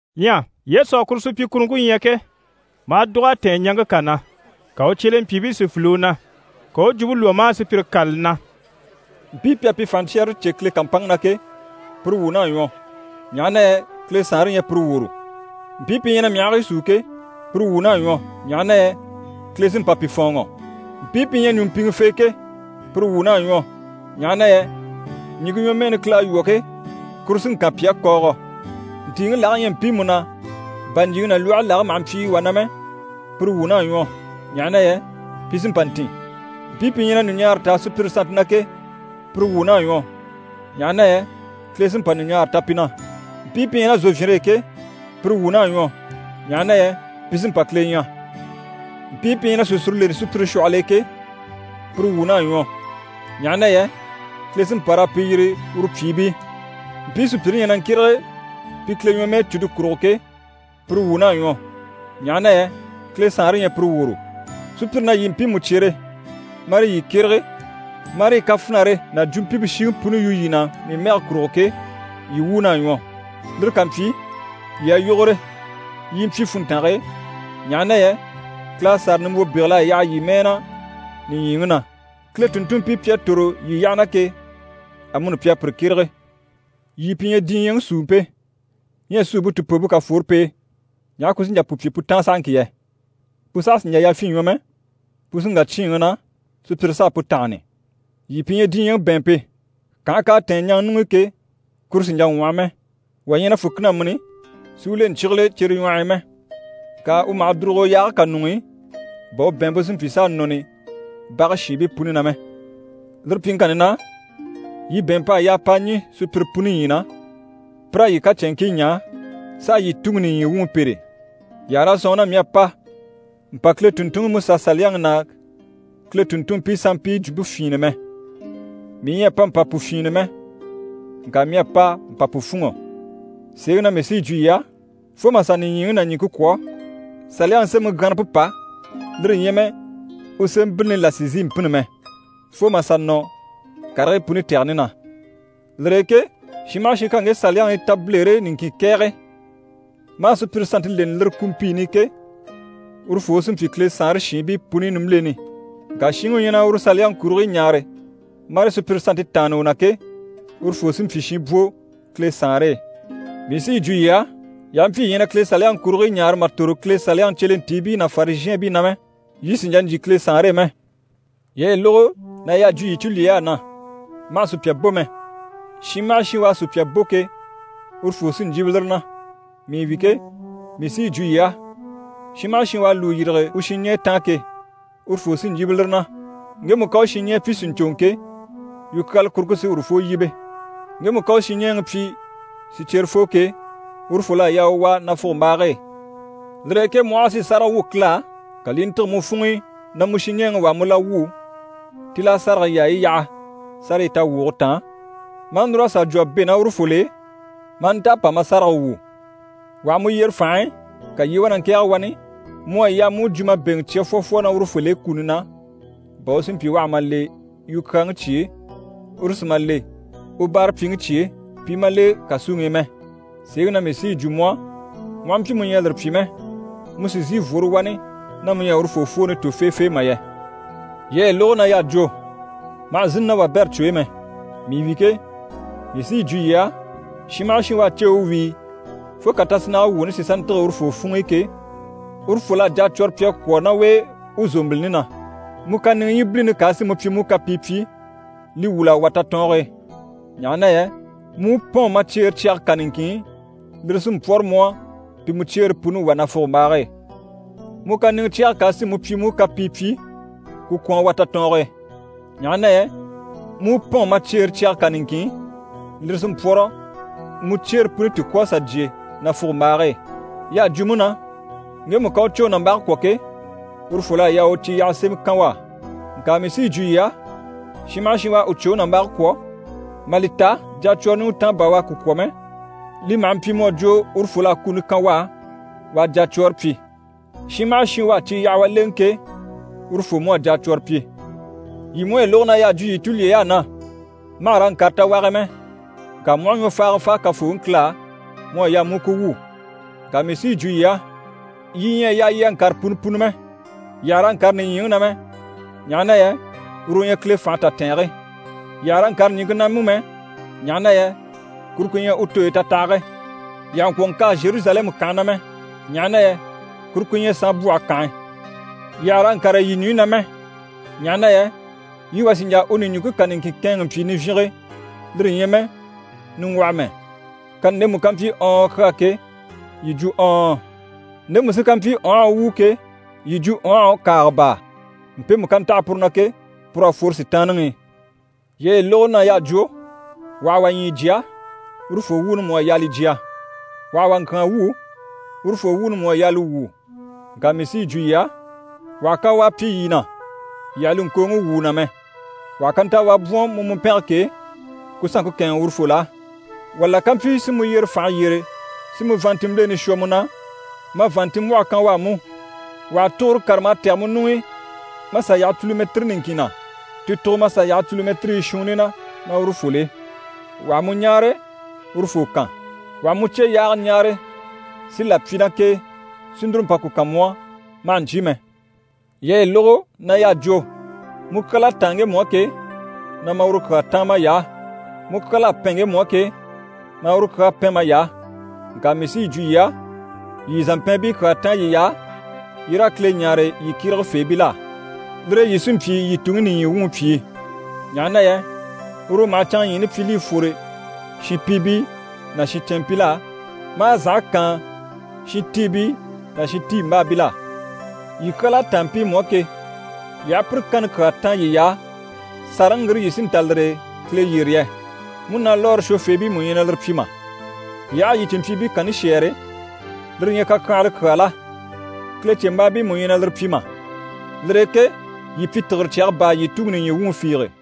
Ɲyɛ Yesu à kuru supyikuruŋke ɲya ke, maa dùg'a tɛ̀ɛn ɲaŋke kà na. Ka u cyelempyiibii si file u na. Ka u u jwumpe lwɔ́ maa sùpyire kâlali na: «Mpii pi à pi fànhaɲcyɛrɛre cè Kile kàmpanŋke na ke, pire wuun'à ɲwɔ, ɲaha na yɛ Kile Saanre ɲyɛ pire woro. Mpii pi ɲyɛ na myahii súu ke, pire wuun'à ɲwɔ, ɲaha na yɛ Kile sí n‑pa pi fɔ̀ɔnŋɔ. Mpii pi ɲyɛ ɲùmpiŋɛfee ke, pire wuun'à ɲwɔ, ɲaha na yɛ ɲìŋke ɲwɔmɛɛni Kile à lwɔ́ ke, kuru sí n‑kan pi á kɔɔgɔ. Ntìiŋi lage ɲyɛ mpiimu na bà ɲjyìŋi ná lwɔhe lage maha mpyi wà na mɛ, pire wuun'à ɲwɔ, ɲaha na yɛ pi sí n‑pa n‑tìn. Mpii pi ɲyɛ na ɲùɲaara taa sùpyire sannte na ke, pire wuun'à ɲwɔ, ɲaha na yɛ Kile sí n‑pa ɲùɲaara ta pi na. Mpii pi ɲyɛ ná zòvyinre e ke, pire wuun'à ɲwɔ, ɲaha na yɛ pi sí n‑pa Kile ɲya. Mpii pi ɲyɛ na sìsure leni sùpyire shwɔhɔl'e ke, pire wuun'à ɲwɔ, ɲaha na yɛ Kile sí n‑pa raa pi yiri uru pyìibii. Mpii sùpyire ɲyɛ na ŋkyérege pi Kile ɲwɔmɛɛcuni kurugo ke, pire wuun'à ɲwɔ, ɲaha na yɛ Kile Saanre ɲyɛ pire woro. Sùpyire na yii mpiimu cyere, marii yii kyérege, marii kafinare ná jwumpimpe shiŋi puni yu yii na, mii mɛge kurugo ke, yii wuun'à ɲwɔ. Lire ká mpyi, yii a yógore, yii i mpyi funntange e, ɲaha na yɛ Kile à sàra nimbwo bégel'a yaha yii mɛɛ na nìɲyiŋi na. Kile tùnntunmpii pi à tòro yii yyaha na ke, amuni pi à pire kyérege. Yii pi ɲyɛ diɲyɛŋi suumpe. Ɲyɛ suumpe tìpoompe ká fworo p'e, ɲaha ku sí n‑jà pu pyi pu táan sahaŋki yɛ? Pu saha sì n‑jà yafyin ɲwɔ mɛ, pu sí n‑wà cyíinŋi na, sùpyire s'a pu tánhani. Yii pi ɲyɛ diɲyɛŋi bɛ̀ɛnmpe. Kànhe k'à tɛ̀ɛn ɲaŋa ɲuŋ'i ke, kuru sì n‑jà ŋwɔhɔ mɛ. Wà ɲyɛ na fùkina mîni si u le ɲcyígile cere ɲwɔh'i mɛ. Ŋka u maha dùrugo yaage kà ɲuŋ'i, bà u bɛ̀ɛnmpe si mpyi s'a nɔni bage shiinbii puni na mɛ. Lire pyiŋkanni na, yii bɛ̀ɛnmp'à yaa p'a ɲî sùpyire puni ɲyii na, pi raa yii kacɛnŋkii ɲaa, s'a yii Tuŋi nìɲyi wuŋi pêre. Yii àha raa sɔ̂nŋi na mii à pa mpa Kile tùnntunŋiMusaSaliyaŋi ná Kile tùnntunmpii sanmpii jwumpe fyìinnɛ mɛ. Mii ɲyɛ a pa mpa pu fyìinnɛ mɛ, ŋka mii à pa mpa pu fûnŋɔ. Sèeŋi na mii sí yi jwo yii á, fo mà sà nìɲyiŋi ná ɲìŋke kwɔ̀, Saliyaŋi sémɛŋi gyanrampe pà, lire ɲyɛ mɛ u sémɛbilini là sì n‑sìi n‑pînni mɛ, fo mà sà nɔ karigii puni tɛgɛni na. Lire e ke shin maha shin ká ŋge Saliyaŋi tabilere niŋkin kɛ̀ɛgɛ, maa sùpyire sannte leni lire kumpiini i ke, urufoo u sí n‑pyi Kile Saanre shiinbii puni nimbileni. Ŋka shinŋi u ɲyɛ na uru Saliyaŋi kurigii ɲaare marii sùpyire sannte taanni u na ke, urufoo sí n‑pyi shinbwo Kile Saanre e. Mii sí yi jwo yii á, yii aha mpyi yii ɲyɛ na Kile Saliyaŋi kurigii ɲaare mà tòro Kile Saliyaŋi cyelentiibii ná Farizhɛɛnbii na mɛ, yii sì n‑jà n‑jyè Kile Saanre e mɛ. Yii à yi lógo na y'à jwo yii tulyey'á na “Ma hà sùpya bò mɛ. Shin maha shin u à sùpya bò ke, urufoo sí n‑yíbe lire na.” Mii wi ke, mii sí yi jwo yii á, shin maha shin u à u lùu yîrige u shinɲɛɛ taan ke, urufoo sí n‑yíbe lire na. Ŋgemu ká u shinɲɛɛ pyi “Sìɲcoŋɔ!” ke, yukyaala kuruŋke sí urufoo yíbe. Ŋgemu ká u shinɲɛɛŋi pyi “Sìcyerefoo!” ke, urufol'à yaa u wà nafugombaage e. Lire e ke mu aha a si sáraga wwû Kile á, ka li i ntîge mu funŋ'i na mu shinɲɛɛŋi wà à mu la wwû, tíl'a sárage yaayi yaha sárayi tawwuge taan ma a núr'a sà jwo a bɛ̂ ná urufol'e, ma a nta a pa ma sárage wwû. Wà ha mu yyere fànhe e, ka yii i wá na ŋkɛ̀ɛge wani, mu à yaa mu u jwumabeŋɛ cya fwɔfwɔ ná urufol'e kuni na, bà u si mpyi u àha ma le yukyaaŋi cye e, uru si ma le u báarapyiŋi cye e, pi i ma le kàsuŋi i mɛ. Sèeŋi na mii sí yi jwo mu á, mu aha mpyi mu ɲyɛ a lire pyi mɛ, mu sì n‑sìi n‑fworo wani ná mu ɲyɛ a urufoo fwooni tò feefee mà yɛ! Yii à yi lógo na y'à jwo “Ma hà zínni ná wabɛrɛ cwo e mɛ.” Mii wi ke, mii sí yi jwo yii á, shin maha shin u à ceewe wíi fo ká tasinnage wuuni si sà ntîge urufoo funŋ'i ke, urufol'à jacwɔrɔ pyi a kwɔ̀ ná u e u zòmbilini na. Mu kàniŋɛ ɲyibilini ká a si mu pyi mu u kapii pyi, li wwûl'a wà tatɔɔnge e. Ɲaha na yɛ mu u mpɔ̂ɔn ma cyeere cyage kà niŋkin i, lire sí n‑pwɔ́rɔ mu á pi mu cyeere puni wà nafugombaage e. Mu kàniŋɛ cyɛge ká a si mu pyi mu u kapii pyi, ku kwɔ̀n a wà tatɔɔnge e. Ɲaha na yɛ mu u mpɔ̂ɔn ma cyeere cyage kà niŋkin i, lire sí n‑pwɔ́rɔ, mu cyeere puni ti ŋkwɔ̀ a sà jyè nafugombaage e. Y'à jwo mú na “Ŋgemu ká u cwoŋi nàmbage kwɔ̀ ke, urufol'à yaa u cíyaha sémɛ kan u á.” Ŋka mii sí yi jwo yii á, shin maha shin u à u cwoŋi nàmbage kwɔ̀, mà li ta jacwɔrɔ ɲùŋɔ taan bà u à ku kwɔ̀ mɛ, li maha mpyi mu à jwo urufol'à kuni kan u á, u a jacwɔɔre pyi. Shin maha shin u à ciyahawa lèŋɛ ke, urufoo mú à jacwɔrɔ pyi. Yii mú à yi lógo na y'à jwo yii tulyey'á na “Ma hà raa ŋkâre tawage e mɛ, ŋka mu aha ɲwɔfaaga fáa Kafooŋi Kile á, mu à yaa mu u ku wwû.” Ŋka mii sí yi jwo yii á, yii ɲyɛ a yaa yii a ŋkâre punɔ punɔ mɛ. Yii àha raa ŋkâre nìɲyiŋi na mɛ, ɲaha na yɛ uru u ɲyɛ Kile fànhe tatɛɛnge. Yii àha raa ŋkâre ɲìŋke na mú mɛ, ɲaha na yɛ kuru ku ɲyɛ u tooyi tatahage. Yii àha ŋkwɔ̀ ŋkâa Zheruzalɛmu kànhe na mɛ, ɲaha na yɛ kuru ku ɲyɛ “Saanbwɔhe kànhe.” Yii àha raa ŋkâre yii ɲùɲyi na mɛ, ɲaha na yɛ yii wà sì n‑jà u ɲùɲjuŋke kà niŋkin kɛ̂ɛnŋɛ mpyi nivyinge, lire ɲyɛ mɛ niŋgwɔhɔ mɛ. Kani ndemu ká mpyi “Ɔɔn” kyaa ke, yii jwo “Ɔɔn” ndemu sí ká mpyi “Ɔnhɔ” wuu ke, yii jwo “Ɔnhɔ” kàaga baa. Mpemu ká ntaha puru na ke, pur'à fworo Sitaanniŋi i. Yii à yi lógo na y'à jwo “Wà ha wà ɲyii jya, urufoo wuuni mú à yaa li jya, wà ha wà ŋkyàan wwû, urufoo wuuni mú à yaa li wwû.” Ŋka mii sí yi jwo yii á, wà ha kawaa pyi yii na, yii àha li ŋkooŋi wwû u na mɛ. Wà ha kantawaa bwɔ̀n mu mùmpɛnge k'e, ku sanŋke kɛ̂ɛnŋɛ urufol'á. Wà la ká mpyi si mu yyere fànhe yyére si mu vàanntinmbileni shwɔ mu na, ma vàanntinmbwɔhe kan u á mú. Wà ha tuguro kárama a tɛ̀gɛ mu ɲuŋ'i mà sà yaha culumɛtiri niŋkin na, ti tugo mà sà yaha culumɛtirii shuunni na, ná urufol'e. Wà ha mu ɲáare, urufoo kan. Wà ha mu cyeyaaga ɲáare si là pyi ná k'e si núru mpa ku kan mu á, ma hà ɲcyé mɛ. Yii à yi lógo na y'à jwo “Mu kyal'à táan ŋgemu á ke, na ma uru kyaa táan may'á, mu kyal'à pɛn ŋgemu á ke, maa uru kyaa pɛn may'á.” Ŋka mii sí yi jwo yii á, yii yii zàmpɛɛnbii kyaa táan yiy'á, yii raa Kile ɲáare yii kyéregefeebil'á. Lire e yii sí n‑pyi yii Tuŋi nìɲyi wuŋi pyìi. Ɲaha na yɛ uru u maha canŋaɲyiini pyi li i fwore shinpiibii ná shincɛnmpil'á, maa zànhe kaan shintiibii ná shintiimbaabil'á. Yii kyal'à táan mpiimu á ke, yii aha pire kanni kyaa táan yiy'á, sàraŋi ŋgire yii sí n‑ta lire e Kile yyére yɛ? Múnalwɔɔre shwofeebii mú ɲyɛ na lire pyi mà? Yii aha a yii cìnmpyiibii kanni shɛ́ɛre, lire ɲyɛ kakyanhala kyaa la? Kilecembaabii mú ɲyɛ na lire pyi mà? Lire e ke yii pyi tìgire cyaga baa, yii Tuŋi nìɲyi wuŋi fiige.